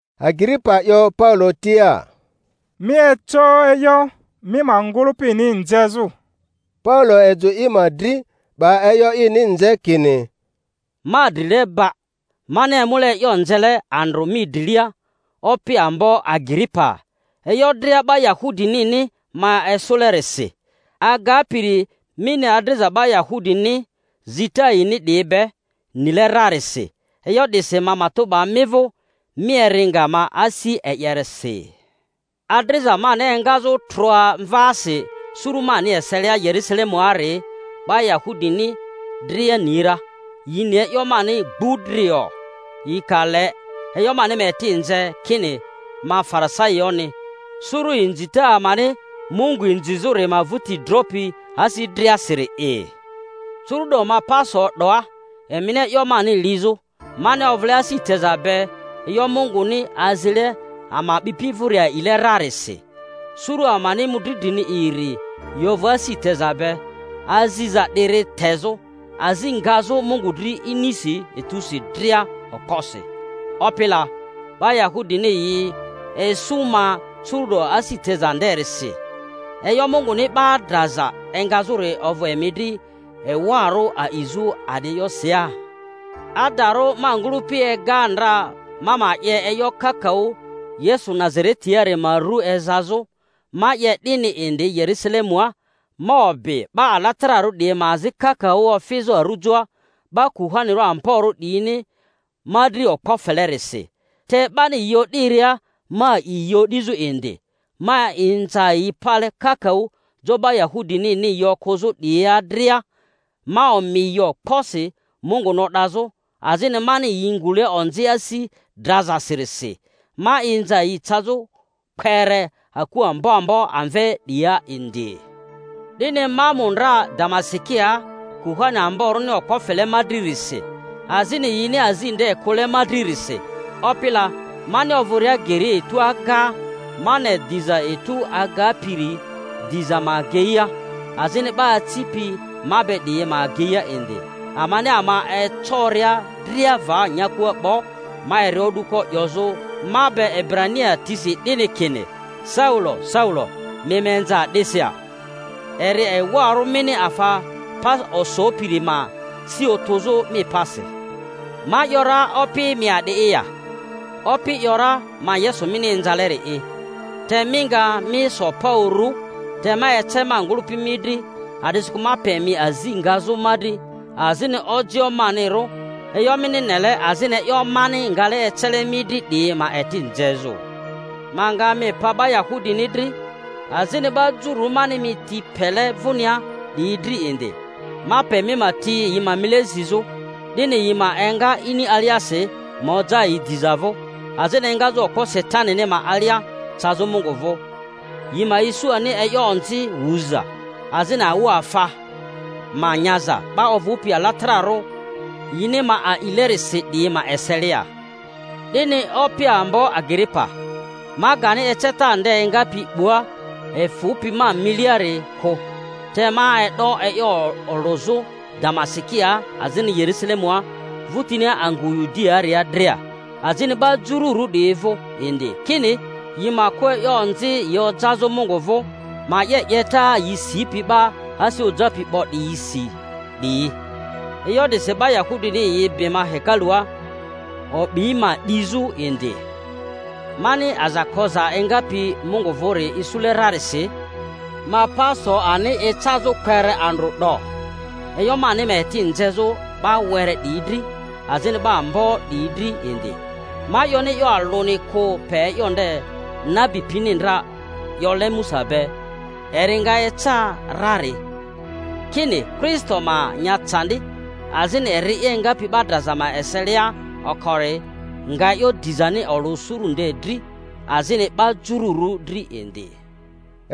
Agiripa 'yo Paulo tia, Mi eco e'yo mi ma ngᴜlᴜpini nzezᴜ. Paulo ejᴜ i ma dri, 'ba e'yo ini nze kini: Ma drileba, mani emule e'yo nzele andrᴜ mi drilia, Opi ambo Agiripa, e'yo dria 'ba Yahudinini ma esᴜlerisi, agapiri mini adriza 'ba Yahudini zita yini 'diyi be nile rarisi; e'yo 'disi ma matᴜ 'ba mi vᴜ mi eri nga ma asi e'yeresi. Adriza mani engazᴜ trᴜa mvaasi suru mani eselia Yerusalemuari, 'ba Yahudini dria ni ra. Yi ni e'yo mani gbudrio, yi ka le e'yo mani ma eti nze, kini, ma Farisaioᴜni, suru inzita amani Mungu inzizᴜri ma vᴜti dropi asi driasiri'i. Curu'do ma pa so 'doa emini e'yo mani lizᴜ, mani ovᴜle asi teza be e'yo Munguni azile ama a'bipi vᴜri a'ile rarisi. Suru amani mᴜdri drini iri yi ovᴜ asi teza be aziza 'diri tezᴜ, azi ngazᴜ Mungu dri inisi etusi dria okposi. Opi la, 'ba Yahudini yi esᴜ ma curu'do asi teza nderisi! E'yo Munguni 'ba draza engazᴜri ovᴜ emi dri ewarᴜ a'izᴜ a'di e'yosi ya? Adarᴜ, ma ngᴜlᴜpi ega ndra ma ma 'ye e'yo kakaᴜ Yesu Nazaretiari ma ru ezazᴜ. Ma 'ye 'dini indi Yerᴜsalemua; ma obi 'ba alatararᴜ 'diyi ma azi kakaᴜ ofizᴜ arᴜjoa, 'ba kuhani amborᴜ 'diyini ma dri okpo felerisi, te 'bani yi o'diria ma a'i yi o'dizᴜ indi. Ma inza yi pale kakaᴜ jo 'ba Yahudinini yi okᴜzᴜ 'diyia dria, ma omi yi okposi Munguni o'dazᴜ; azini mani yi ngule onzi asi drazasirisi ma inza yi cazᴜ kpere aku ambo ambo amve 'diyia indi. 'Dini ma mu ndra Damasikia kuhani amborᴜni okpo fele ma dririsi, azini yini azi nde kᴜle ma dririsi. Opi la, mani ovᴜria geria etu agaa, ma ne diza etu agapiri dizᴜ ma ageia, azini 'ba acipi ma be 'diyi ma ageia indi. Amani ama ecoria dria va nyakua 'bo, ma eri o'duko 'yozᴜ ma be Ebrania tisi 'dini kini, Saulo, Saulo, mi ma inza a'disi ya? Eri ewarᴜ mini afa pa osopiri ma si otᴜzᴜ mi pasi. Ma ‘yora, Opi, mi a'di'i ya? Opi ‘yora, Ma Yesu mini inzaleri'i. Te mi nga, mi so pa urᴜ; te ma ece ma ngᴜlᴜpi mi dri, a'disikᴜ ma pe mi azi ngazᴜ ma dri, azini ojioᴜ manirᴜ e'yo mini nele azini e'yo mani ngale ecele mi dri 'diyi ma eti nzezᴜ. Ma nga mi pa 'ba Yahudini dri, azini 'ba Jururᴜ mani mi ti pele vᴜnia 'diyi dri indi. Ma pe mi ma ti yi ma mile zizᴜ, 'dini yi ma enga ini aliasi ma oja yi diza vᴜ, azini engazᴜ okpo Satanini ma alia cazᴜ Mungu vᴜ, yi ma isu ani e'yo onzi wuza, azini awᴜafa ma nyaza 'ba ovᴜpi alatararᴜ yini ma alilerisi 'diyi ma eselia. 'Dini, Opi ambo Agiripa, ma gani eceta nde engapi 'bua efᴜpi ma miliari kᴜ, te ma e'do e'yo olᴜzᴜ Damasikia, azini Yerusalemua, vᴜtinia angᴜ Yudiaaria dria, azini 'ba Jururᴜ 'diyi vᴜ indi, kini, yi ma kᴜ e'yo onzi yi ojazᴜ Mungu vᴜ, ma 'ye 'yeta yi sipi 'ba asi ojapi 'bo 'diyisi 'diyi. E'yo 'disi 'ba Yahudini yi bi ma hekalua, o'bi ma 'dizᴜ indi. Mani aza koza engapi Mungu vᴜri isule rarisi, ma pa so ani ecazᴜ kpere andrᴜ 'do, e'yo mani ma eti nzezᴜ 'ba were 'diyi dri azini 'ba ambo 'diyi dri indi. Ma 'yoni e'yo alᴜni kᴜ pe e'yo nde nabi pini ndra 'yole Musa be, eri nga eca rari: kini Kristo ma nya candi, azini eri'i engapi 'ba draza ma eselia okori nga e'yo dizani olᴜ suru nde dri, azini 'ba Jururᴜ dri indi.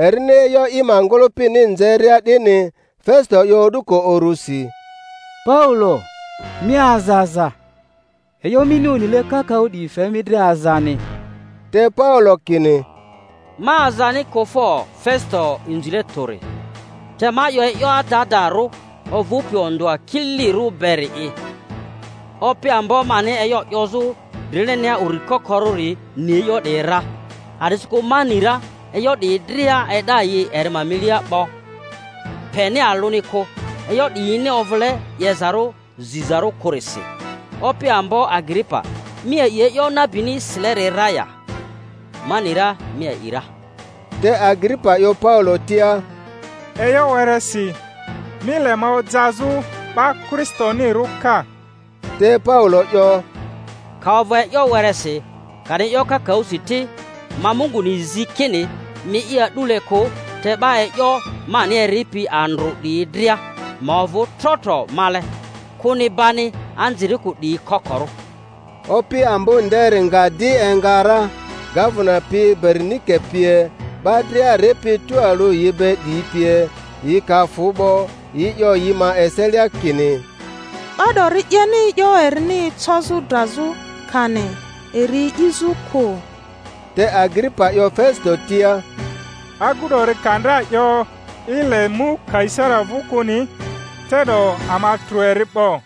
Erini e'yo i ma ngᴜlᴜpini nzeria 'dini, Fesito 'yo o'duko urᴜsi, Paulo, mi aza aza; e'yo mini onile kakaᴜ 'diyi fe mi dri azani! Te Paulo kini, Ma azani kᴜ fo, Fesito inzile tᴜri, te ma 'yo e'yo adadarᴜ ovᴜpi ondᴜa kililirᴜ beri'i. Opi ambo mani e'yo 'yozᴜ drilenia uri kokorᴜri ni e'yo 'diyi ra; a'disikᴜ ma ni ra e'yo 'diyi dria e'da yi eri ma milia 'bo peni alᴜni kᴜ, e'yo 'diyini ovᴜle 'yezarᴜ zizarᴜ kᴜrisi. Opi ambo Agiripa, mi a'i e'yo nabini sileri ra ya? Ma ni ra mi a'i ra. Te Agiripa 'yo Paulo tia, E'yo weresi mi le ma ojazᴜ 'ba Kristonirᴜ ka! Te Paulo 'yo, Ka ovᴜ e'yo wereasi kani kakaᴜsi ti, ma Munguni zi kini mi'i a'dule kᴜ, te 'ba e'yo mani eripi andrᴜ 'diyi dria, ma ovᴜ tro tro male—kᴜni bani anzirikᴜ 'diyi kokorᴜ. Opi ambo nderi nga di enga ra, gavena pi, Berinike pie, 'ba dria ripi tualᴜ yi be 'diyi pie; yi ka fᴜ 'bo, yi 'yo yi ma eselia kini, 'Ba 'dori 'yeni e'yo erini ecozᴜ drazᴜ, kani eri 'izᴜ kᴜ. Te Agiripa 'yo Fesito tia, Agu 'dori ka ndra 'yo i le mu Kaisari vᴜ kᴜni, te'do ama trᴜ eri 'bo.